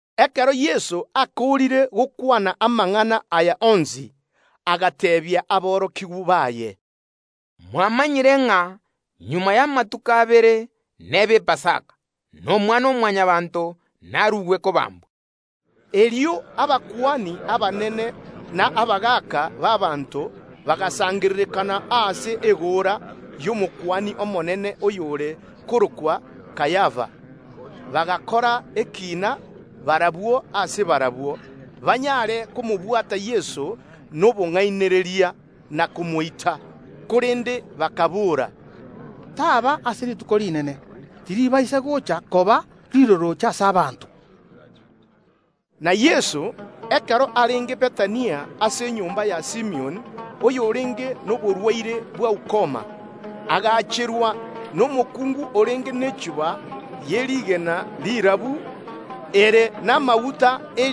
Ekero Yeso akoorire gokwana amang’ana aya onsi, agateebia aborokigwa baye, “Mwamanyire ng’a magega y’amatuko abere n’ebe Epasaka, na Omwana-o-Mwanyabaanto naruegwe kobambwa.” Erio abakuani abanene n’etureti y’ abanto bagasangererekana ase egoora y’Omokuani omonene oyore korokwa Kayafa; erio bakaigwana bagakora omoroberio banyare komobwata Yeso bobisi, na komoita. Korende bakaboora, “Taba ase rituko rinene, tiribaisa goocha koba rirorooche ase abanto.” Na Yeso, ekero arenge Bethania ase enyomba ya Simioni, oyorenge noborwaire bwa ukoma, agaacherwa n’omokuungu orenge nechuba ye rigena rirabu ere namaguta ye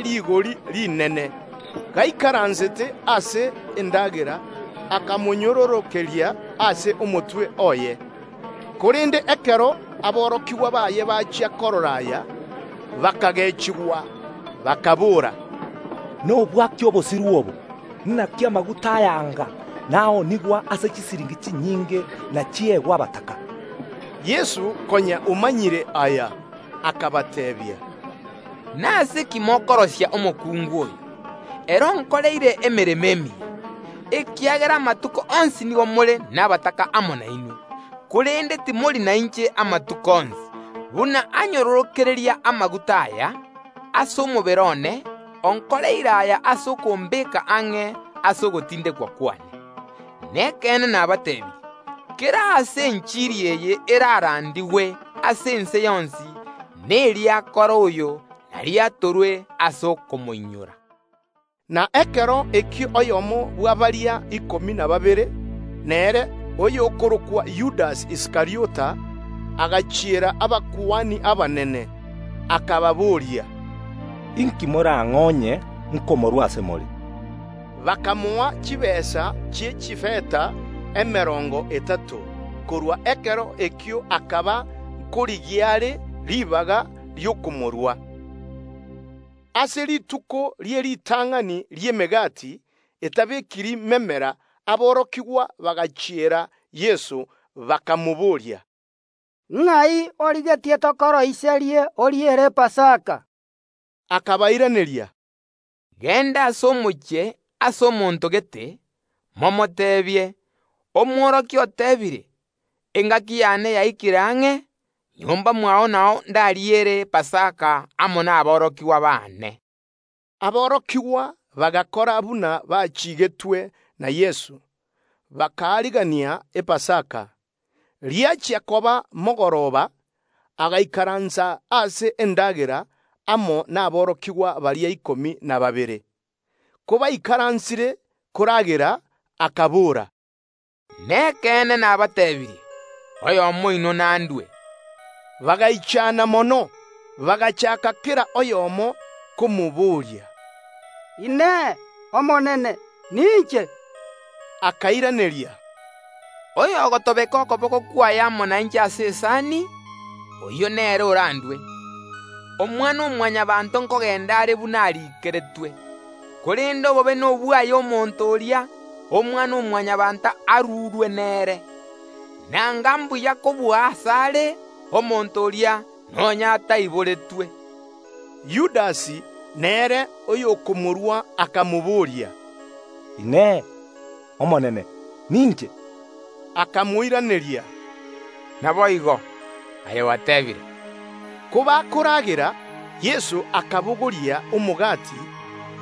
rigori rinene ne rimisu rigiya; gaikaransete ase endagera, akamonyororokeria ase omotwe oye. Korende ekero aborokigwa baye bachia korora aya, bakagechigwa, bakaboora, “Nobwa ki obosiru obo: Inaki amaguta aya anga taonigwa ase chisiringi chinyinge na chiegwe abataka?” Yeso, konya omanyire aya, akabateebia, “Nase ki mokorosia omokungu oyo? Ere onkoreire emeremo emiya, ekiagera amatuko onsi nigo more nabataka amo nainwe, korende timori nainche amatuko onsi. Buna anyororokeria amaguta aya ase omobere one, onkoreire aya ase okombeeka ang’e ase ogotindekwa kwane. Nekeene nabateebirie: Kera aase enchiri eye erarandigwe ase ense yonsi, neri akora oyo nariatorwe ase okomoinyora.” Na ekero ekio oyomo bwa baria ikomi na babere, nere, oyokorokwa Yudasi Iskariota, agachiera abakuani abanene, akababoria, “Inki morang’e onye nkorua Yeso ase more?” Bakamoa chitaabu chi’echifeta emerongo etato. Korwa ekero ekio akaba nkorigia are ribaga ri’okomorua. Ase rituko rie ritang’ani ri’Emegati etabekiri memera aborokigwa bagachiera Yeso, bakamobooria, “Ng’ai origetie tokoroisie oriere Epasaka?” Akabairaneria, “Genda ase omochie ase omonto gete, momoteebie: Omworokia oteebire: Engaki y’ane yaikire ang’e; nyomba mwao nao ndariere Epasaka amo naborokigwa bane.” Aborokigwa bagakora buna bachiigetwe na Yeso, bakaarigania Epasaka. Riachia koba mogoroba, agaikaransa ase endagera, amo naborokigwa baria ikomi na babere. Kobaikaransire koragera, akabora, “Nekeene nabateebirie: oyomo oino nandue.” Bagaichana mono, bagachaaka kera oyomo komoboria, “Inee! Omonene, ninche?” Akairaneria, “Oyo ogotobeka okoboko kwaye amo nainche ase esani, oyio nere orandue. Omwana-o-Mwanyabaanto nkogenda are buna amariiko agoteeba, korende obobe nobwaye omonto oria, Omwana-o-Mwanyabaanto arurwe nere! Nigo ere buya kobua asare omonto oria, nonya ataiboretwe.” Yudasi, nere oyokomorua, akamobooria, “Inee! Omonene, ninche? Akamoiraneria: Naboigo. Aye gwateebire.” Kobakoragera, Yeso akabogoria omogati,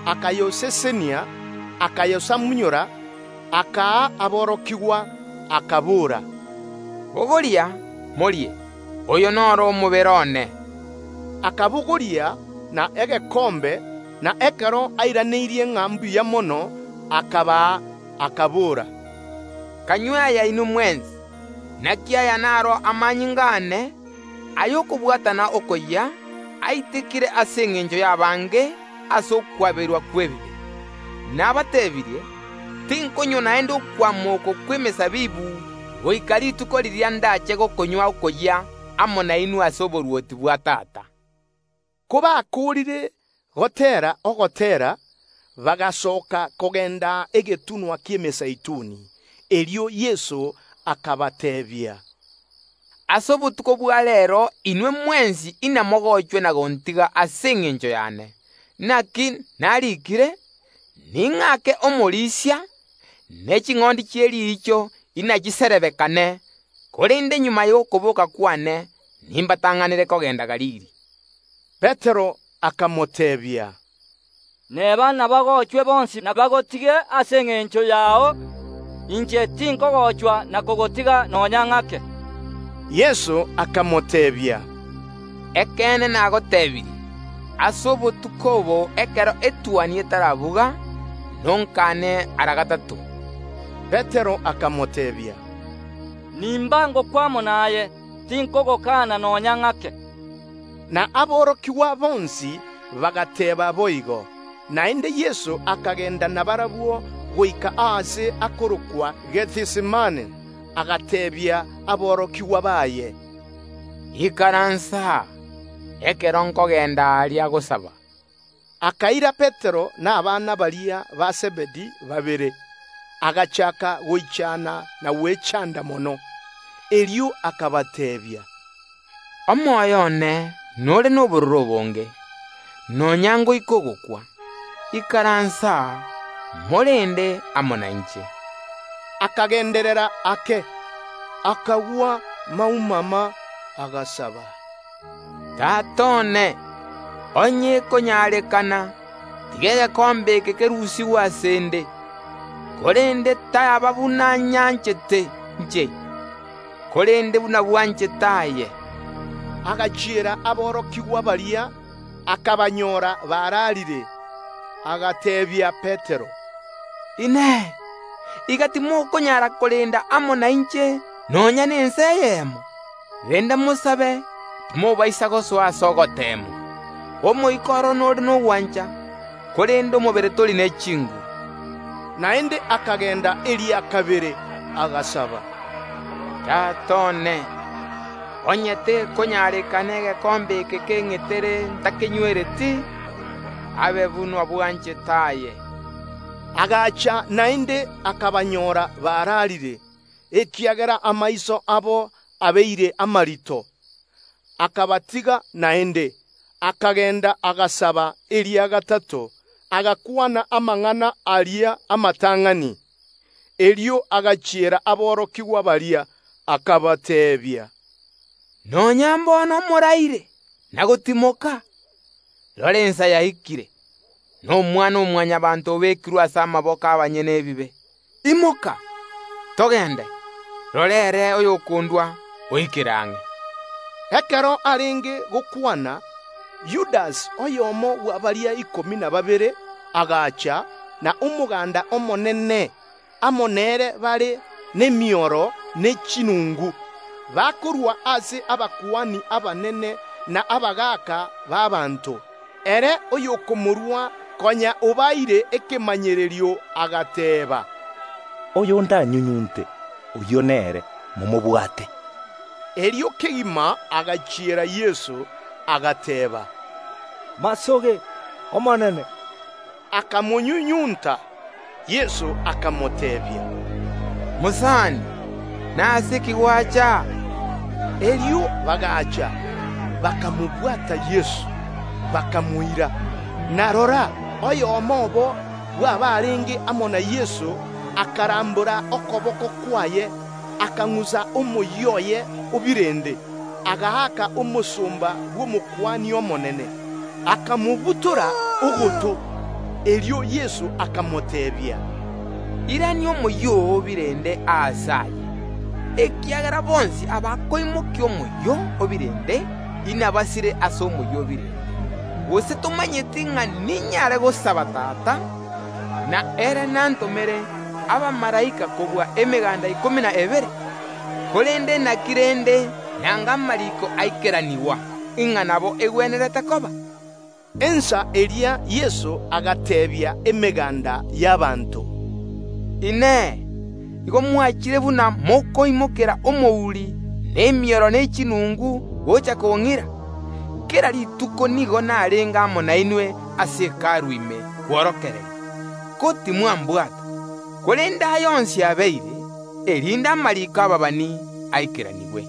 akayosesenia, akayosamunyora, akaa aborokigwa, akabora, “Bogoria, morie; oyo noro omobere one.” Akabogoria na egekombe, na ekero airaneirie ng’a mbuya mono, akabaa, akabora, “Kanywe aya inwe mwensi, naki aya naro amanyinga aane y’okobwatana okoyia, aitekire ase engencho y’abange ase okwaberwa kw’ebibe. Nabateebirie, tinkonywa naende okwama oko kw’emesabibu goika rituko riria ndache gokonywa oboyia amo nainwe ase oborwoti bwa Tata.” Kobakoorire goteera Ogoteera, bagasoka kogenda egetunwa ki’Emezeituni. Erio Yeso akabateebia, “Ase obotuko bwa reero inwe mwensi inamogochwe ase engencho y’ane na gontiga; naki nariikire: Ning’ake omorisia, ne ching’ondi chie riicho inachiserebekane. Korende magega y’okobooka kwane nimbatang’anere kogenda Galili.” Petero akamoteebia, “Neba inabagochwe bonsi ase engencho yao na bagotige, inche tinkogochwa na kogotiga nonya ng’ake.” Yeso akamoteebia, “Ekeene nagoteebirie: Ase obotuko obo, ekero etuoni etarabuga, nonkane ara gatato.” Petero akamoteebia, “Nimba ngokwa amo naye, tinkogokana nonya ng’ake.” Na aborokigwa bonsi bagateeba boigo. Naende Yeso akagenda nabarabwo goika aase akorokwa Gethisemane, agateebia aborokigwa baye, “Ikaransa aa ekero nkogenda aria gosaba.” Akaira Petero na abana baria ba Zebedi babere, agachaaka goichana na gwechanda mono. Erio akabateebia, “Omoyo one nore nobororo obonge, nonya ngoika ogokwa; ikaransa aa, morende amo nainche.” Akagenderera ake, akagwa maumama, agasaba, “Tata one, onye ekonyarekana, tiga egekombe eke kerusigwe ase ’nde; korende taba buna nyanchete inche, korende buna bwanchete aye.” Agachiera aborokigwa baria, akabanyora bararire, agateebia Petero, “Inee! Iga timokonyara korenda amo nainche nonya nensa eyemo? Renda, mosabe, timobaisa gosoa ase ogoteemwa; omoika oro nore nogwancha, korende omobere tori ne chinguru.” Naende akagenda eria kabere, agasaba, “Tata one, onye tekonyarekana egekombe eke keng’etere ntakenywereti, abe buna bwanchete aye.” Agacha naende, akabanyora bararire; ekiagera amaiso abo abeire amarito. Erio Yeso akabatiga naende, akagenda, agasaba eria gatato agakwana amang’ana aria amatang’ani. Erio agachiera aborokigwa baria, akabateebia, “Nonya mbono nigo moraire na gotimoka? Rora ensa yaikire, na Omwana-o-Mwanyabaanto obekirwe ase amaboko y’abanyene ebibe. Imoka, togende, rora, ere oyokondua oikire ang’e.” Ekero arenge gokwana, Yudasi, oyomo bwa baria ikomi na babere, agacha, na omoganda omonene amo nere bare nemioro ne chinungu, bakorwa ase abakuani abanene n’etureti y’ abanto. Ere oyokomorua, konya obaeire ekemanyererio, agateeba, “Oyo ndanyunyunte, oyio nere, momobwate.” Erio kegima agachiera Yeso, agateeba, “omorembe obe naye, Omonene!” Akamonyunyunta. Yeso akamoteebia, “Mosani, kora bwango eki giakoreta aa?” Erio bagaacha, bakamobwata Yeso, bakamoira. Na rora, oyomo obo bw’abarenge amo na Yeso akarambora okoboko kwaye, akang’usa omoyio oye o birende, agaaka omosomba bw’Omokuani omonene, akamobutora ogoto. Erio Yeso akamoteebia, “Irania omoyio oo o birende aase aye, ekiagera bonsi abakoimokia omoyio o birende inabasire ase omoyio o birende. Gose tomanyeti ng’a ninyare gosaba Tata, na ere nantomere abamalaika kobua emeganda ikomi na ebere? Korende naki rende nanga amariiko aikeranigwa, ng’a nabo egwenerete koba?” Ensa eria Yeso agateebia emeganda y’ abanto, “Inee! Igo mwachire buna abamokoumokera omouri nemioro ne chinungu gocha kong’ira? Kera rituko naikaransete amo nainwe ime ase Hekalu ase okworokereria, ko timwambwata. Korende aya onsi abeire, erinde amariiko y’ababani aikeranigwe.”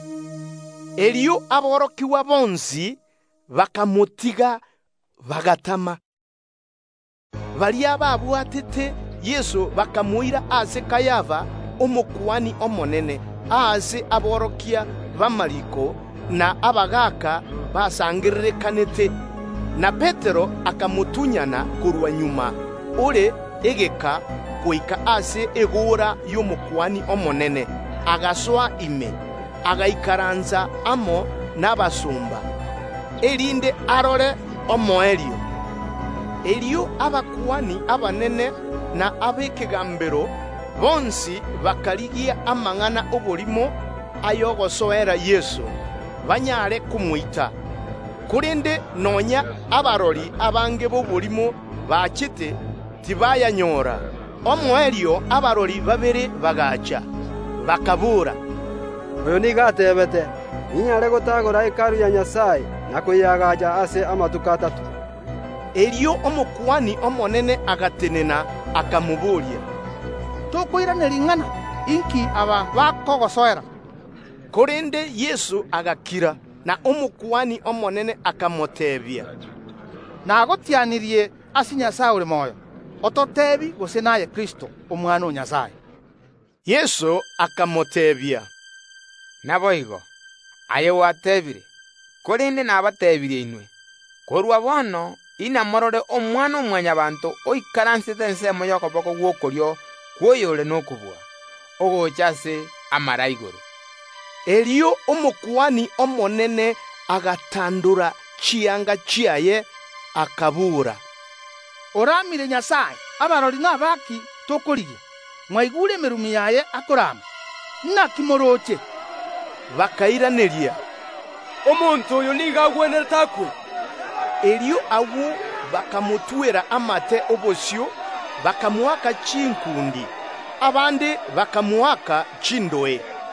Erio aborokigwa bonsi bakamotiga, bagatama. Baria babwatete Yeso bakamoira ase enyomba ya Kayafa Omokuani omonene, aase aborokia b’amariiko na abagaaka basangererekanete. Na Petero akamotunyana korwa magega ore egeka, goika ase egoora y’Omokuani omonene, agasoa ime, agaikaransa amo nabarendi, erinde arore eki gekoba omoerio. Erio abakuani abanene na ab’ekegaambero bonsi bakarigia amang’ana y’oborimo y’ogosoera Yeso, banyare komoita; korende nonya abarori abange b’oborimo bachete, tibayanyora. Omoerio abarori babere bagaacha, bakaboora, “Omonto oyo nigo ateebete: Ninyare gotagora Hekalu ya Nyasae, na koyeagaacha ase amatuko atato.” Erio Omokuani omonene agatenena akamobooria Yeso, “Tokoiraneria ing’ana? Inki aba bakogosoera?” Korende Yeso agakira. Na Omokuani omonene akamoteebia, “Nagotianirie ase Nyasae ore moyo, ototeebie gose naye Kristo, Omwana o Nyasae.” Yeso akamoteebia, “Naboigo aye gwateebire, korende nabateebirie inwe, korwa bono inamorore Omwana-o-Mwanyabaanto oikaransete ensemo y’okoboko gw’okorio kw’Oyore nokobua, ogocha ase amare a igoro.” Erio Omokuani omonene agatandora chianga chiaye, akabora, “Oramire Nyasae; abarori naba ki tokorigia? Mwaigure emerumi yaye akorama. Inaki morooche?” Bakairaneria, “Omonto oyo nigo agwenerete akwe.” Erio agwo bakamotwera amate obosio, bakamoaka chinkundi; abande bakamoaka chindoe,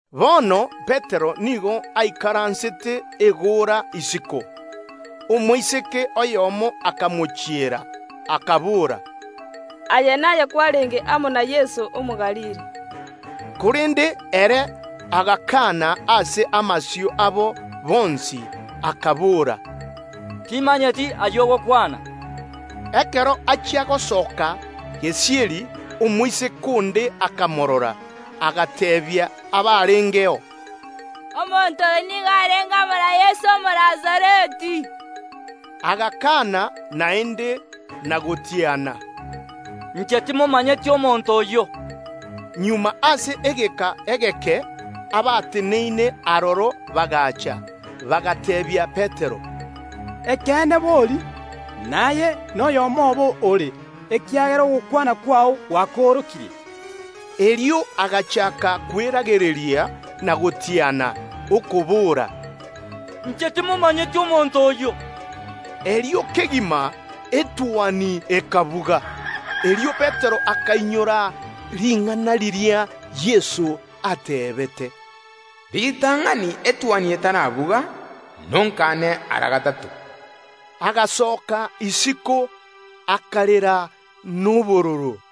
Bono Petero nigo aikaransete egoora isiko. Omoiseke oyomo omosomba bw’Omokuani omonene akamochiera, akabora, “Aye naye kwarenge amo na Yeso Omogalili.” Korende ere agakaana ase amasio abo bonsi, akabora “Timanyeti ayio ogokwana.” Ekero achia gosoka gesieri, omoiseke onde akamorora, agateebia abarengeo, “Omonto oyo nigo arenge amo na Yeso, Omonazareti.” Agakaana naende, na gotiana, “Inche timomanyeti omonto oyio.” Magega ase egeka egeke abateneine aroro bagaacha, bagateebia Petero, “Ekeene bori, naye noyomo obo ore, ekiagera ogokwana kwao gwakoorokirie.” Erio agachaaka kweragereria na gotiana, okobora, “Inche timomanyeti omonto oyio.” Agwo kegima etuoni ekabuga. Erio Petero akainyora ring’ana riria Yeso ateebete, “Ritang’ani etuoni etarabuga, nonkane ara gatato.” Agasoka isiko, akarera nobororo.